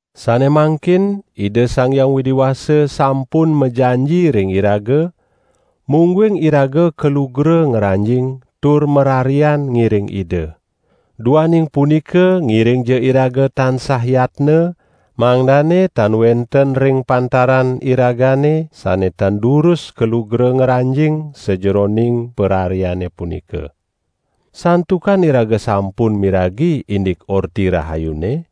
Sane mangkin, Ida Sang Hyang Widi Wasa sampun majanji ring iraga, mungguing iraga kalugra ngranjing tur mararian ngiring Ida. Duaning punika ngiringja iraga tansah yatna, mangdane tan wenten ring pantaran iragane sane tan durus kalugra ngranjing sajeroning parariane punika. Santukan iraga sampun miragi indik Orti Rahayune,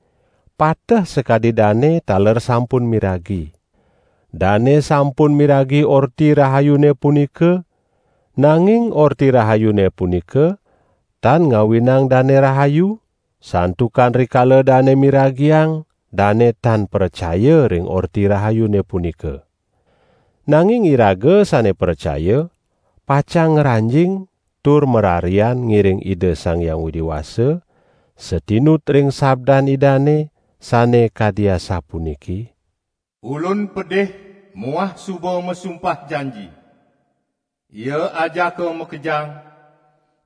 pateh sakadi dane taler sampun miragi. Dane sampun miragi Orti Rahayune punika, nanging Orti Rahayune punika tan ngawinang dane rahayu, santukan rikala dane miragiang, dane tan pracaya ring Orti Rahayune punika. Nanging iraga sane pracaya, pacang ngranjing tur mararian ngiring Ida Sang Hyang Widi Wasa, satinut ring sabdan Idane, sane kadi asapuniki: "Ulun pedih muah suba masumpah janji: Ia ajaka makejang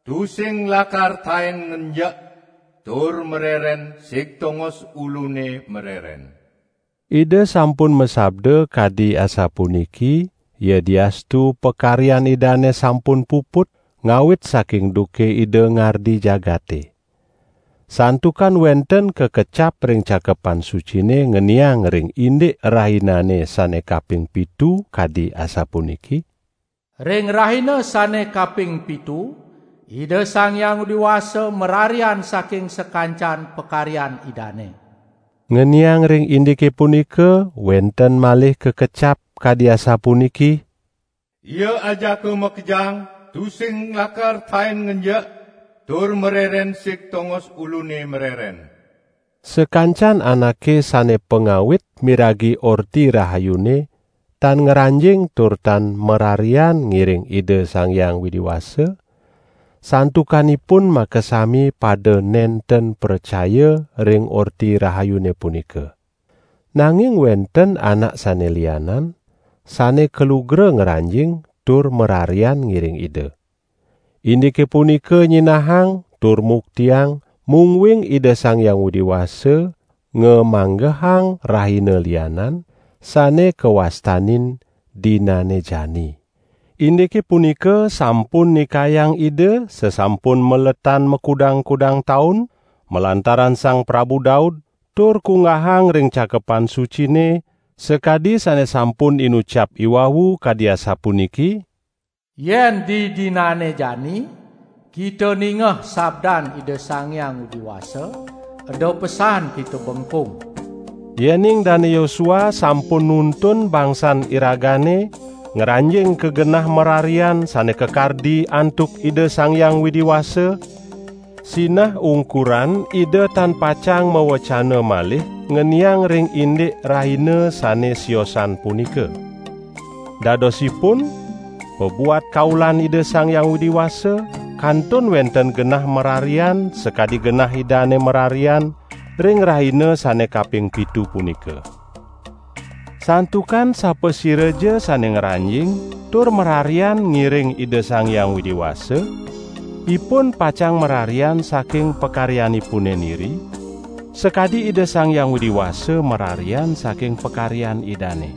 tusing lakar taen ngenjek tur mareren sig tongos Ulune mareren." Ida sampun masabda kadi asapuniki, yadiastu pakaryan Idane sampun puput, ngawit saking duke Ida ngardi jagate. Santukan wenten kakecap ring Cakepan Sucine ngeniang ring indik rahinane sane kaping pitu kadi asapuniki: "Ring rahina sane kaping pitu, Ida Sang Hyang Widi Wasa mararian saking sakancan pakaryan Idane." Ngeniang ring indike punika wenten malih kakecap kadi asapuniki: "Ia ajaka makejang tusing lakar taen ngenjek tur mareren sig tongos Ulune mareren." Sakancan anake sane pangawit miragi Orti Rahayune tan ngranjing tur tan mararian ngiring Ida Sang Hyang Widi Wasa, santukan ipun makasami pada nenten pracaya ring Orti Rahayune punika. Nanging wenten anak sane lianan, sane kalugra ngranjing tur mararian ngiring Ida. Indike punika nyinahang tur muktiang, mungguing Ida Sang Hyang Widi Wasa ngamanggehang rahina lianan, sane kawastanin "Dinane Jani". Indike punika sampun ndikayang Ida sasampun maletan makudang-kudang taun, malantaran Sang Prabu Daud, tur kunggahang ring Cakepan Sucine sakadi sane sampun inucap iwau kadi asapuniki: "Yen didinane jani kita ningeh sabdan Ida Sang Hyang Widi Wasa eda pesan kita bengkung." Yening Dane Yosua sampun nuntun bangsan iragane ngranjing ka genah mararian sane kakardi antuk Ida Sang Hyang Widi Wasa, sinah ungkuran Ida tan pacang mawecana malih ngeniang ring indik rahina sane siosan punika. Dadosipun pabuat kaulan Ida Sang Hyang Widi Wasa kantun wenten genah mararian sakadi genah Idane mararian ring rahina sane kaping pitu punika. Santukan sapasiraja sane ngranjing tur mararian ngiring Ida Sang Hyang Widi Wasa, ipun pacang mararian saking pakaryanipune niri, sakadi Ida Sang Hyang Widi Wasa mararian saking pakaryan Idane.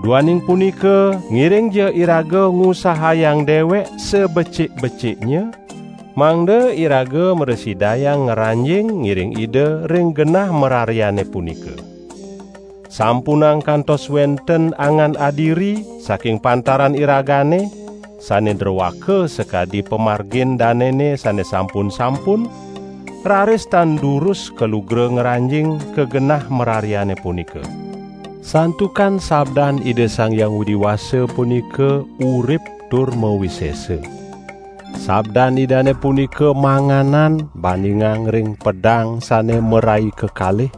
Duaning punika, ngiringja iraga ngusahayang dewek sabecik-beciknya, mangda iraga mrasidayang ngranjing ngiring Ida ring genah marariane punika. Sampunang kantos wenten angan adiri saking pantaran iragane sane droaka sakadi pamargin danene sane sampun-sampun, raris tan durus kalugra ngranjing ka genah marariane punika. Santukan sabdan Ida Sang Hyang Widi Wasa punika urip tur mawisesa. Sabdan Idane punika manganan bandingang ring pedang sane marai kekalih.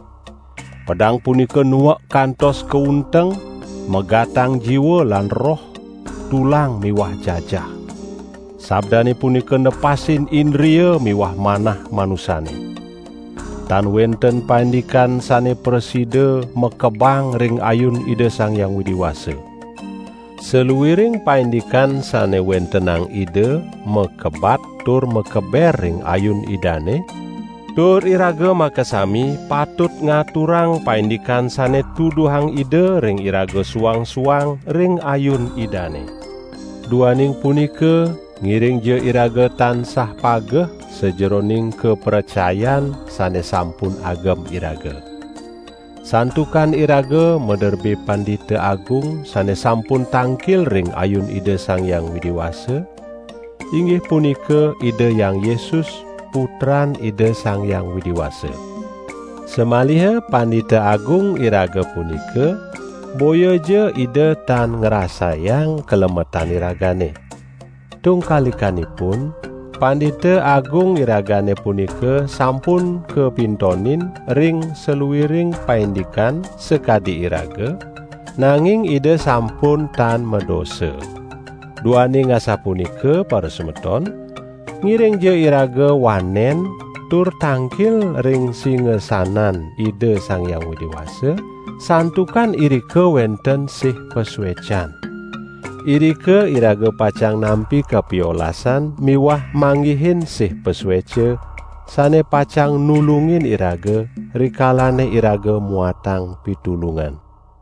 Pedang punika nuek kantos ka unteng, megatang jiwa lan roh, tulang miwah jajah. Sabdane punika nepasin indria miwah manah manusane. Tan wenten paindikan sane prasida makebang ring ayun Ida Sang Hyang Widi Wasa. Saluiring paindikan sane wentenang Ida makebat tur makeber ring ayun Idane; tur iraga makasami patut ngaturang paindikan sane tuduhang Ida ring iraga suang-suang ring ayun Idane. Duaning punika, ngiringja iraga tansah pageh sajeroning kapracayan sane sampun agem iraga. Santukan iraga maderbe Pandita Agung sane sampun tangkil ring ayun Ida Sang Hyang Widi Wasa, inggih punika Ida Hyang Yesus, Putran Ida Sang Hyang Widi Wasa. Samaliha Pandita Agung iraga punika boyaja Ida tan ngrasayang kalemetan iragane. Tungkalikanipun, Pandita Agung iragane punika sampun kapintonin ring saluiring paindikan sakadi iraga, nanging Ida sampun tan madosa. Duaning asapunika parasemeton, ngiringja iraga wanen tur tangkil ring singasanan Ida Sang Hyang Widi Wasa, santukan irika wenten sih pasuecan. Irika iraga pacang nampi kapiolasan miwah manggihin sih pasueca, sane pacang nulungin iraga rikalane iraga muatang pitulungan.